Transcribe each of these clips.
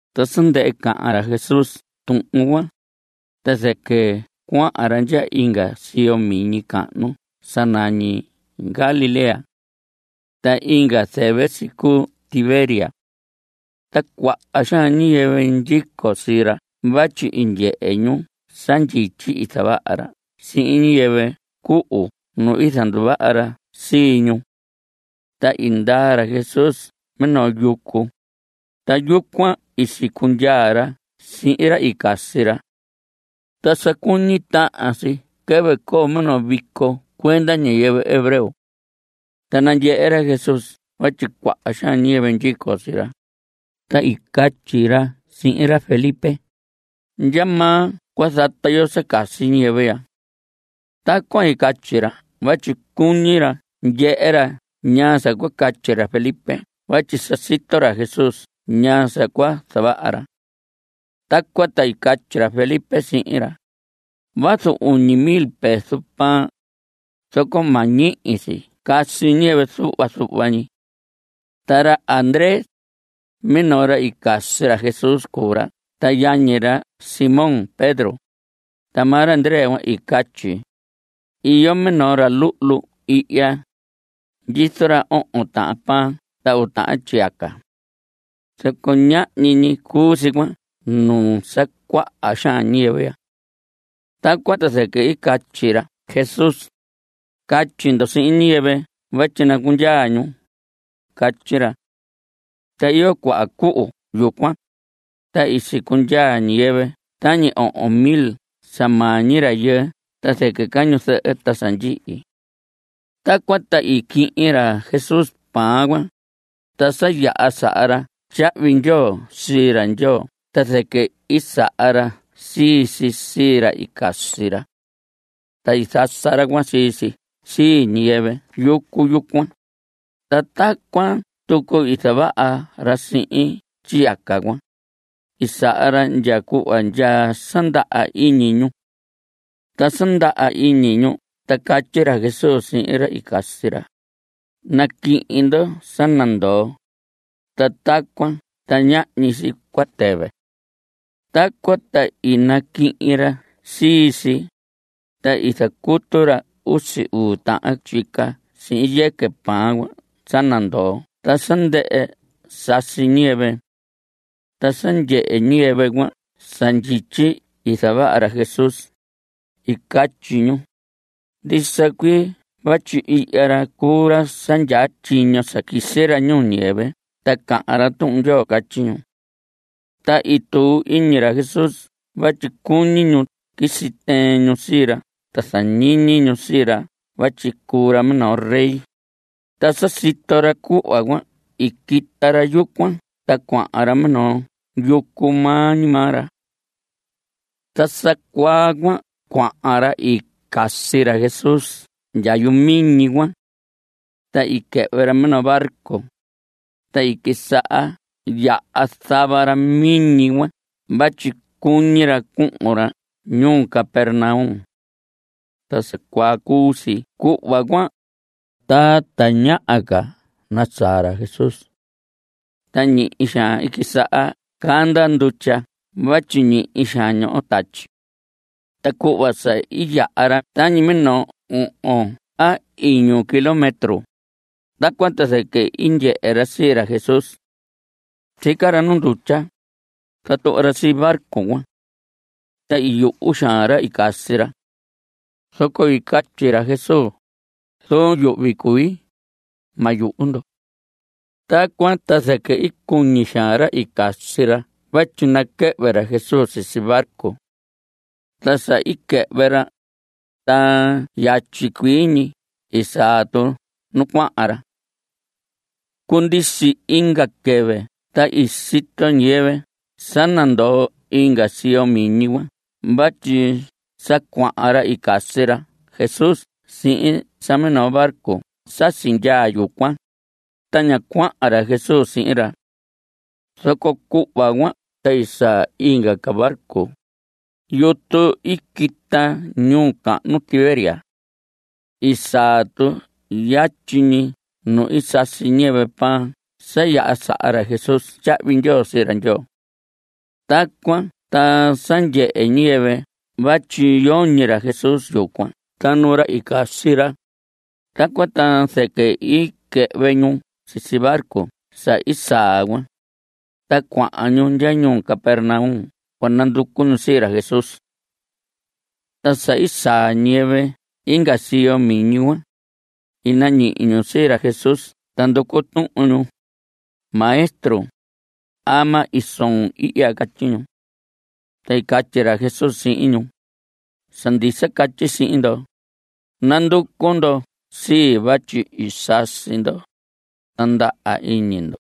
Ta sa ndɨhɨ cahan ra Jesús tuhun cuan, ta zɨquɨ cuahan ra ndya inga siyo miñi cahnu sa nañi Galilea. Ta inga zɨvɨ si cuu Tiberias. Ta cuaha xaan ñiyɨvɨ ndyico sii ra vatyi i ndyehe ñu sa ndyityi i zavaha ra sihin ñiyɨvɨ cuhu nu i zanduvaha ra sii ñu. Ta i ndaa ra Jesús minoo yucu, ta yucuan i sicundyaa ra sihin ra i casi ra. Ta sa cuñi tahan si quɨvɨ coo minoo vico cuenda ñiyɨvɨ hebreo. Ta nandyehe ra Jesús vatyi cuaha xaan ñiyɨvɨ ndyico sii ra, ta i catyi ra sihin ra Felipe: ¿Ndyamaa cua zata yo sa casi ñiyɨvɨ ya? Tacuan i catyi ra vatyi cuñi ra ndyehe ra ñaa sa cua catyi ra Felipe vatyi sa sito ra Jesús ñaa sa cua zavaha ra. Tacuan ta i catyi ra Felipe sihin ra: Vazu uñi mil peso pan, zoco ma ñihi si casi ñiyɨvɨ zuhva zuhva ñi. Ta ra Andrés, minoo ra i casi ra Jesús cuu ra ta yañi ra Simón Pedro, ta maa ra Andrés cuan i catyi: Iyo minoo ra luhlu ihya; ndyizo ra ohon tahan pan ta uu tahan tyiyaca. Zoco ñahñi ñi cuu si cuan nuu sa cuaha xaan ñiyɨvɨ ya. Tacuan ta zɨquɨ i catyi ra Jesús: Catyi ndo sihin ñiyɨvɨ vatyi nacundyaa ñu. Catyi ra. Ta iyo cuaha cuhu yucuan, ta i sicundyaa ñiyɨvɨ tañi ohon mil sa maa ñi rayɨɨ (ta zɨquɨ ca ñu zɨhɨ ta sa ndyihi). Tacuan ta i quihin ra Jesús pan cuan, ta sa yaha saha ra tyahvi ndyoo sii ra Ndyoo ta zɨquɨ i saha ra sii si sii ra i casi ra. Ta i zasa ra cuan sii si sii ñiyɨvɨ yucu yucuan. Ta tacuan tucu i zavaha ra sihin tyiyaca cuan. I saha ra ndya cuhva ndya sa ndaha iñi ñu. Ta sa ndaha iñi ñu ta catyi ra Jesús sihin ra i casi ra: Naquihin ndo sa nandoo, ta tacuan ta ñahñi si cua tɨvɨ. Tacuan ta i naquihin ra sii si, ta i zacutu ra usi uu tahan tyica sihin yɨquɨ pan cuan sa nandoo ta sa ndɨhɨ sasi ñiyɨvɨ. Ta sa ndyehe ñiyɨvɨ cuan sa ndyityi i zavaha ra Jesús, i catyi ñu: Ndisa cuii vatyi ihya ra cuu ra sa ndyaa tyiño sa quisi ra ñuu ñiyɨvɨ ta cahan ra Tuhun Ndyoo. Catyi ñu. Ta i tuu iñi ra Jesús vatyi cuñi ñu quisi tɨɨn ñu sii ra ta zañiñi ñu sii ra vatyi cuu ra minoo rey, ta sa sito ra cuhva cuan i quita ra yucuan ta cuahan ra minoo yucu maa ñi maa ra. Ta sa cuaa cuan cuahan ra i casi ra Jesús ndya yuhu miñi cuan. Ta i quɨhvɨ ra minoo barco, ta i quisaha yaha zava ra miñi cuan vatyi cuñi ra cuhun ra ñuu Capernaum. Ta sa cuaa cuu si cuhva cuan, ta tañaha ca nasaa ra Jesús. Ta ñihi xaan i quisaha canda ndutya vatyi ñihi xaan ñoho tatyi. Ta cuhva sa i yaha ra tañi minoo ohon a iñu kilómetro, tacuan ta zɨquɨ i ndyehe ra sii ra Jesús. Sica ra nu ndutya, ta tuhva ra sii barco cuan. Ta i yuhu xaan ra i casi ra. Zoco i catyi ra Jesús: Zuun yuhvi cui. Ma yuhu ndo. Tacuan ta zɨquɨ i cuñi xaan ra i casi ra vatyi naquɨhvɨ ra Jesús sisi barco. Ta sa i quɨhvɨ ra, ta yatyi cuii ñi i saa tu nu cuahan ra. Cundisi inga quɨvɨ ta i sito ñiyɨvɨ sa nandoo inga siyo miñi cuan vatyi sa cuahan ra i casi ra Jesús sihin sa minoo barco sa sindyaa yucuan, ta ña cuahan ra Jesús sihin ra. Zoco cuhva cuan ta i saa inga ca barco, yutu i quita ñuu cahnu Tiberias. I saa tu yatyi ñi nu i sasi ñiyɨvɨ pan sa yaha saha ra Jesús tyahvi ndyoo sii ra Ndyoo. Tacuan ta sa ndyehe ñiyɨvɨ vatyi yoñi ra Jesús yucuan ta nu ra i casi ra, tacuan ta zɨquɨ i quɨhvɨ ñu sisi barco sa i saa cuan, ta cuahan ñu ndya ñuu Capernaum cua nanducu ñu sii ra Jesús. Ta sa i saa ñiyɨvɨ inga siyo miñi cuan, i nañihi ñu sii ra Jesús ta nducu tuhun ñu: Maestro, ¿ama i soon ihya? Catyi ñu. Ta i catyi ra Jesús sihin ñu: Sa ndisa catyi sihin ndo, nanducu ndo sii vatyi i sasi ndo, ta ndaha iñi ndo.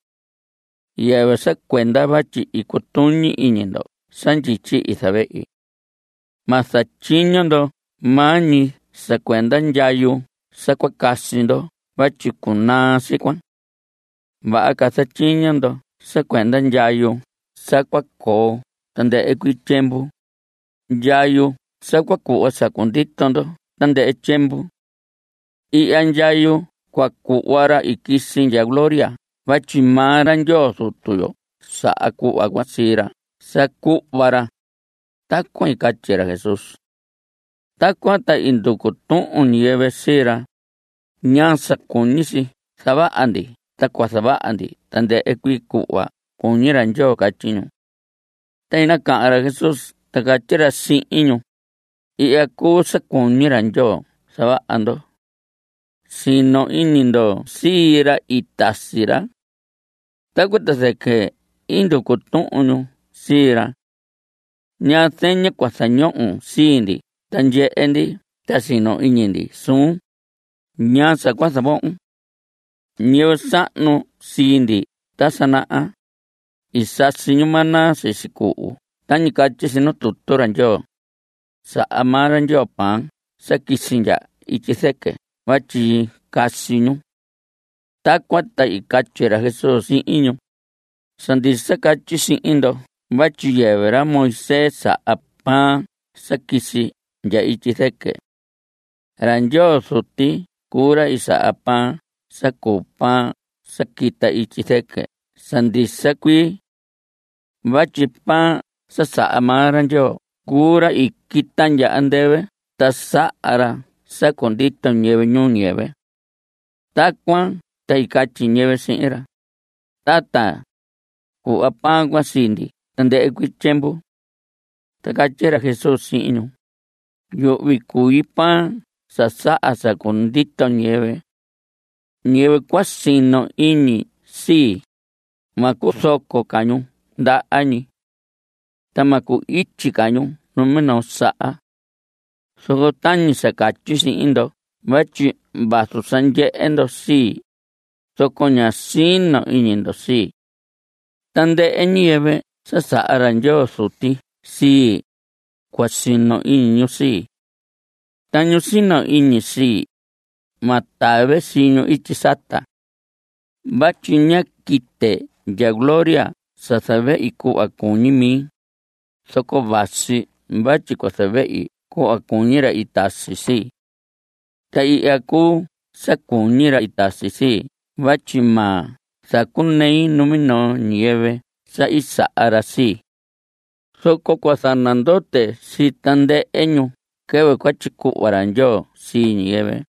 Yɨvɨ sa cuenda vatyi i cutuñi iñi ndo sa ndyityi i zavehi. Ma zatyiño ndo maa ñi sa cuenda ndyayu sa cua casi ndo vatyi cunaa si cuan. Vaha ca zatyiño ndo sa cuenda ndyayu sa cua coo tandɨhɨ tyiemvu, ndyayu sa cua cuhva sa cundito ndo tandɨhɨ tyiemvu. Ihya ndyayu cua cuhva ra i quisi ndya gloria vatyi maa ra Ndyoo Zutu yo saha cuhva cuan sii ra sa cuhva ra. (Tacuan i catyi ra Jesús.) Tacuan ta i nducu tuhun ñiyɨvɨ sii ra: ¿Ñaa sa cuñi si zavaha ndi ta cua zavaha ndi tandɨhɨ cuii cuhva cuñi ra Ndyoo? Catyi ñu. Ta i nacahan ra Jesús ta catyi ra sihin ñu: Ihya cuu sa cuñi ra Ndyoo zavaha ndo. Sino iñi ndo sii ra i tasi ra. Tacuan ta zɨquɨ i nducu tuhun ñu sii ra: ¿Ñaa zeña cua zañohon sii ndi ta ndyehe ndi ta sino iñi ndi suun? ¿Ñaa sa cua zavohon? Ñiyɨvɨ sahnu sii ndi ta sa naha, i sasi ñu maná sisi cuhu tañi catyi tutu ra Ndyoo: “Saha maa ra Ndyoo pan sa quisi ndya ityi zɨquɨ vatyi casi ñu.” Tacuan ta i catyi ra Jesús sihin ñu: Sa ndisa catyi sihin ndo vatyi yɨvɨ ra Moisés saha pan sa quisi ndya ityi zɨquɨ. Ra Ndyoo Zuti cuu ra saha pan sa cuu pan sa quita ityi zɨquɨ sa ndisa cuii. Vatyi pan sa saha maa ra Ndyoo cuu ra i quita ndya andɨvɨ ta saha ra sa cundito ñiyɨvɨ ñuu ñiyɨvɨ. Tacuan ta i catyi ñiyɨvɨ sihin ra: Tata, cuhva pan cuan sii ndi tandɨhɨ cuii tyiemvu. Ta i catyi ra Jesús sihin ñu: Yuhvi cui pan sa saha sa cundito ñiyɨvɨ. Ñiyɨvɨ cua sino iñi sii, ma cuzoco ca ñu ndaha ñi. Ta ma cu‑ityi ca ñu numinoo saha. Zoco tañi sa catyi sihin ndo vatyi vazu sa ndyehe ndo sii, zoco ña sino iñi ndo sii. Tandɨhɨ ñiyɨvɨ sa saha ra Ndyoo Zuti sii, cua sino iñi ñu sii. Ta ñu sino iñi sii, ma tave sii ñu ityi sata. Vatyi ña quite ndya gloria sa zavehi cuhva cuñi mi, zoco vasi vatyi cua zavehi cuhva cuñi ra i tasi sii. Ta ihya cuu sa cuñi ra i tasi sii vatyi ma zacunei numinoo ñiyɨvɨ sa i saha ra sii. Zoco cua zanandote sii tandɨhɨ ñu quɨvɨ cua tyicuhva ra Ndyoo sii ñiyɨvɨ.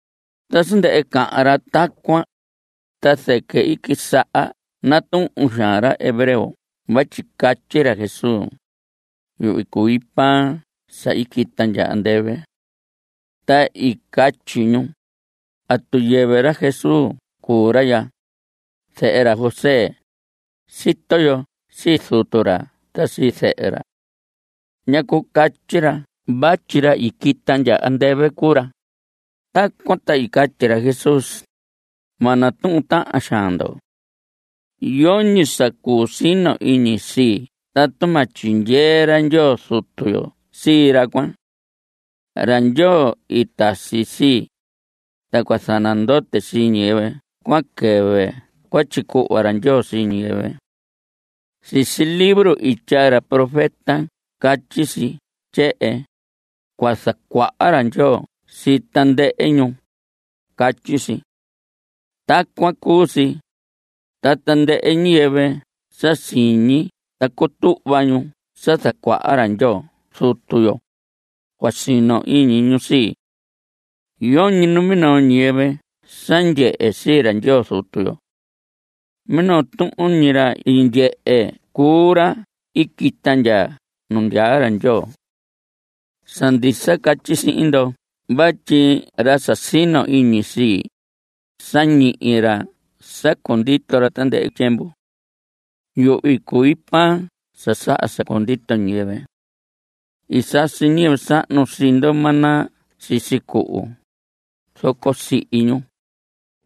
Ta sa ndɨhɨ cahan ra tacuan, ta zɨquɨ i quisaha natuhun xaan ra hebreo vatyi catyi ra Jesús: “Yuhvi cui pan sa i quita ndya andɨvɨ.” Ta i catyi ñu: ¿Atu yɨvɨ ra Jesús cuu ra ya, zehe ra José? Sito yo sii zutu ra ta sii zɨhɨ ra. ¿Ñacu catyi ra vatyi ra i quita ndya andɨvɨ cuu ra? Tacuan ta i catyi ra Jesús: Ma natuhun tahan xaan ndo. Yoñi sa cuu sino iñi sii tatu ma tyindyee ra Ndyoo Zutu yo sii ra cuan. Ra Ndyoo i tasi sii. Ta cua zanandote sii ñiyɨvɨ cuan quɨvɨ cua tyicuhva ra Ndyoo sii ñiyɨvɨ. Sisi libro i tyaa ra profeta catyi si tyehen: “Cua zacuaha ra Ndyoo sii tandɨhɨ ñu.” Catyi si. Tacuan cu si, ta tandɨhɨ ñiyɨvɨ sa siñi ta cutuhva ñu sa zacuaha ra Ndyoo Zutu yo, cua sino iñi ñu sii. Yoñi numinoo ñiyɨvɨ sa ndyehe sii ra Ndyoo Zutu yo. Minoo tuhun ñi ra i ndyehe cuu ra i quita ndya nu ndyaa ra Ndyoo. Sa ndisa catyi sihin ndo vatyi ra sa sino iñi sii, sa ñihi ra sa cundito ra tandɨhɨ tyiemvu. Yuhvi cui pan sa saha sa cundito ñiyɨvɨ. I sasi ñiyɨvɨ sahnu sii ndo maná sisi cuhu, zoco sihi ñu.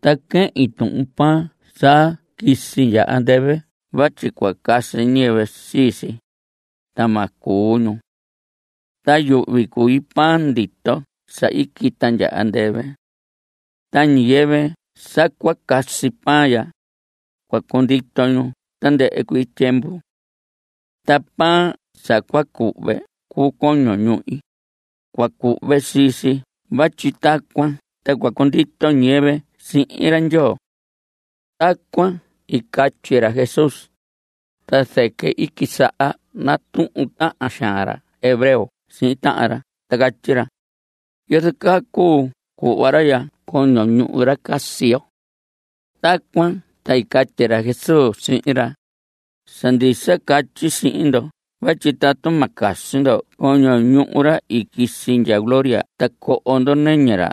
Ta quehin tuhun pan sa quisi ndya andɨvɨ vatyi cua casi ñiyɨvɨ sii si, ta ma cuu ñu. Ta yuhvi cui pan ndito sa i quita ndya andɨvɨ. Ta ñiyɨvɨ sa cua casi pan ya, cua cundito ñu tandɨhɨ cuii tyiemvu. Ta pan sa cua cuhve cuu coño ñuhi. Cua cuhve sii si vatyi tacuan ta cua cundito ñiyɨvɨ sihin ra Ndyoo. Tacuan i catyi ra Jesús, ta zɨquɨ i quisaha natuhun tahan xaan ra hebreo sihin tahan ra ta catyi ra: ¿Yozo caa cuu cuhva ra ya coño ñuhu ra casi yo? Tacuan ta i catyi ra Jesús sihin ra: Sa ndisa catyi sihin ndo vatyi tatu ma casi ndo coño ñuhu ra i quisi ndya gloria ta coho ndo nɨñɨ ra,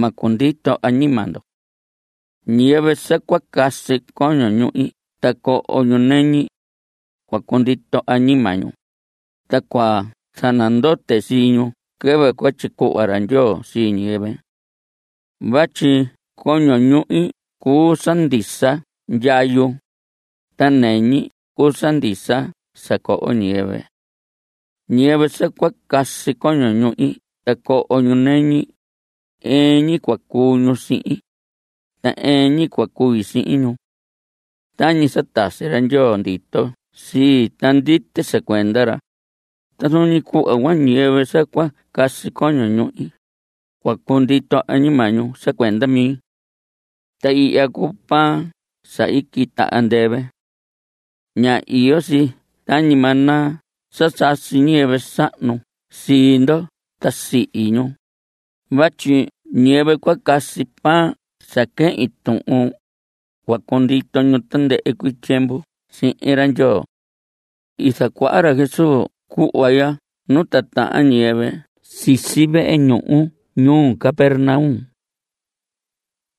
ma cundito añima ndo. Ñiyɨvɨ sa cua casi coño ñuhi ta coho ñu nɨñi, cua cundito añima ñu, ta cua zanandote sii ñu quɨvɨ cua tyicuhva ra Ndyoo sii ñiyɨvɨ. Vatyi coño ñuhi cuu sa ndisa ndyayu, ta nɨñi cuu sa ndisa sa coho ñiyɨvɨ. Ñiyɨvɨ sa cua casi coño ñuhi ta coho ñu nɨñi, ɨɨn ñi cua cuu ñu sihin, ta ɨɨn ñi cua cui sihin ñu. Tañi sa tasi ra Ndyoo ndito sii ta ndite sa cuenda ra, ta zuun ñi cuhva, ñiyɨvɨ sa cua casi coño ñuhi, cua cundito añima ñu sa cuenda mi. Ta ihya cuu pan sa i quita andɨvɨ. Ña iyo si tañi maná sa sasi ñiyɨvɨ sahnu sii ndo ta sihi ñu; vatyi ñiyɨvɨ cua casi pan sa quehin tuhun, cua cundito ñu tandɨhɨ cuii tyiemvu sihin ra Ndyoo. I zacuaha ra Jesús cuhva ya nu titahan ñiyɨvɨ sisi vehe ñuhu ñuu Capernaum.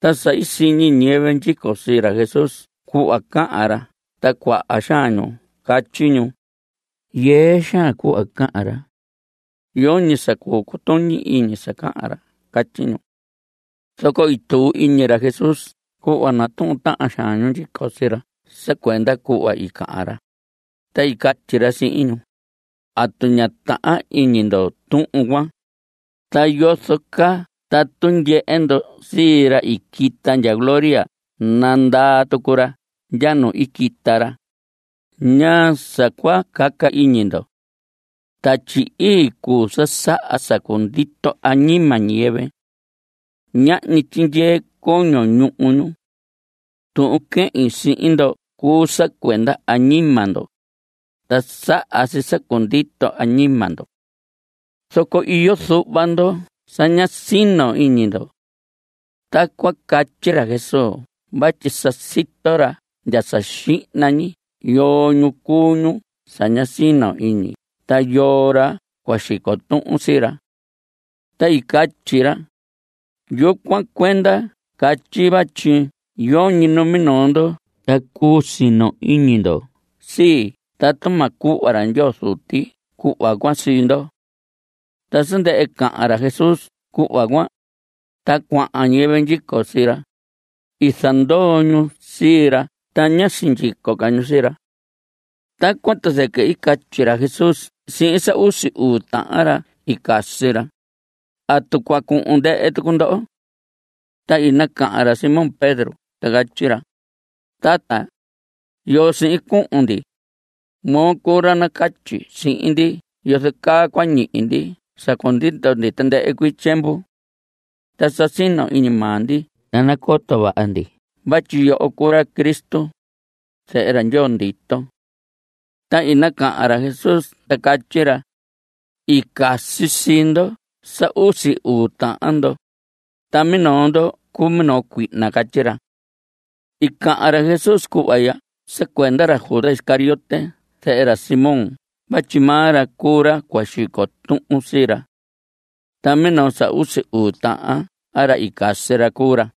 Ta sa i siñi ñiyɨvɨ ndyico sii ra Jesús cuhva cahan ra ta cuaha xaan ñu catyi ñu: Yɨɨ xaan cuhva cahan ra. Yoñi sa cuu cutuñi iñi sa cahan ra. Catyi ñu. Zoco i tuu iñi ra Jesús cuhva natuhun tahan xaan ñu ndyico sii ra sa cuenda cuhva i cahan ra, ta i catyi ra sihin ñu: ¿Atu ña tahan iñi ndo tuhun cuan? ¿Ta yozo caa tatu ndyehe ndo sii ra i quita ndya gloria nandaa tucu ra ndya nu i quita ra? ¿Ñaa sa cua caca iñi ndo? Tatyi Ii cuu sa saha sa cundito añima ñiyɨvɨ. Ñahñi tyindyee coño ñuhu ñu. Tuhun quehin sihin ndo cuu sa cuenda añima ndo, ta saha si sa cundito añima ndo. Zoco iyo zuhva ndo sa ña sino iñi ndo. Tacuan catyi ra Jesús vatyi sa sito ra ndya sa xihna ñi yoo ñu cuu ñu sa ña sino iñi ta yoo ra cua xico tuhun sii ra. Ta i catyi ra: Yucuan cuenda catyi vatyi yoñi numinoo ndo ta cuu sino iñi ndo sii tatu ma cuhva ra Ndyoo Zuti cuhva cuan sii ndo. Ta sa ndɨhɨ cahan ra Jesús cuhva cuan, ta cuaha ñiyɨvɨ ndyico sii ra, i zandoo ñu sii ra ta ñá sindyico ca ñu sii ra. Tacuan ta zɨquɨ i catyi ra Jesús sihin sa usi uu tahan ra i casi ra: ¿Atu cua cuhun ndɨhɨ tucu ndoho? Ta i nacahan ra Simón Pedro ta catyi ra: Tata, ¿Yoo sihin cuhun ndi? Moo cuu ra nacatyi sihin ndi yozo caa cua ñihi ndi sa cundito ndi tandɨhɨ tyiemvu. Ta sa sino iñi maa ndi ta nacoto vaha ndi vatyi yoho cuu ra Cristo, zehe ra Ndyoo ndito. Ta i nacahan ra Jesús ta catyi ra: I casi sii ndo sa usi uu tahan ndo, ta minoo ndo cuu minoo cuihna. Catyi ra. I cahan ra Jesús cuhva ya sa cuenda ra Judas Iscariote zehe ra Simón vatyi maa ra cuu ra cua xico tuhun sii ra. Ta minoo sa usi uu tahan ra i casi ra cuu ra.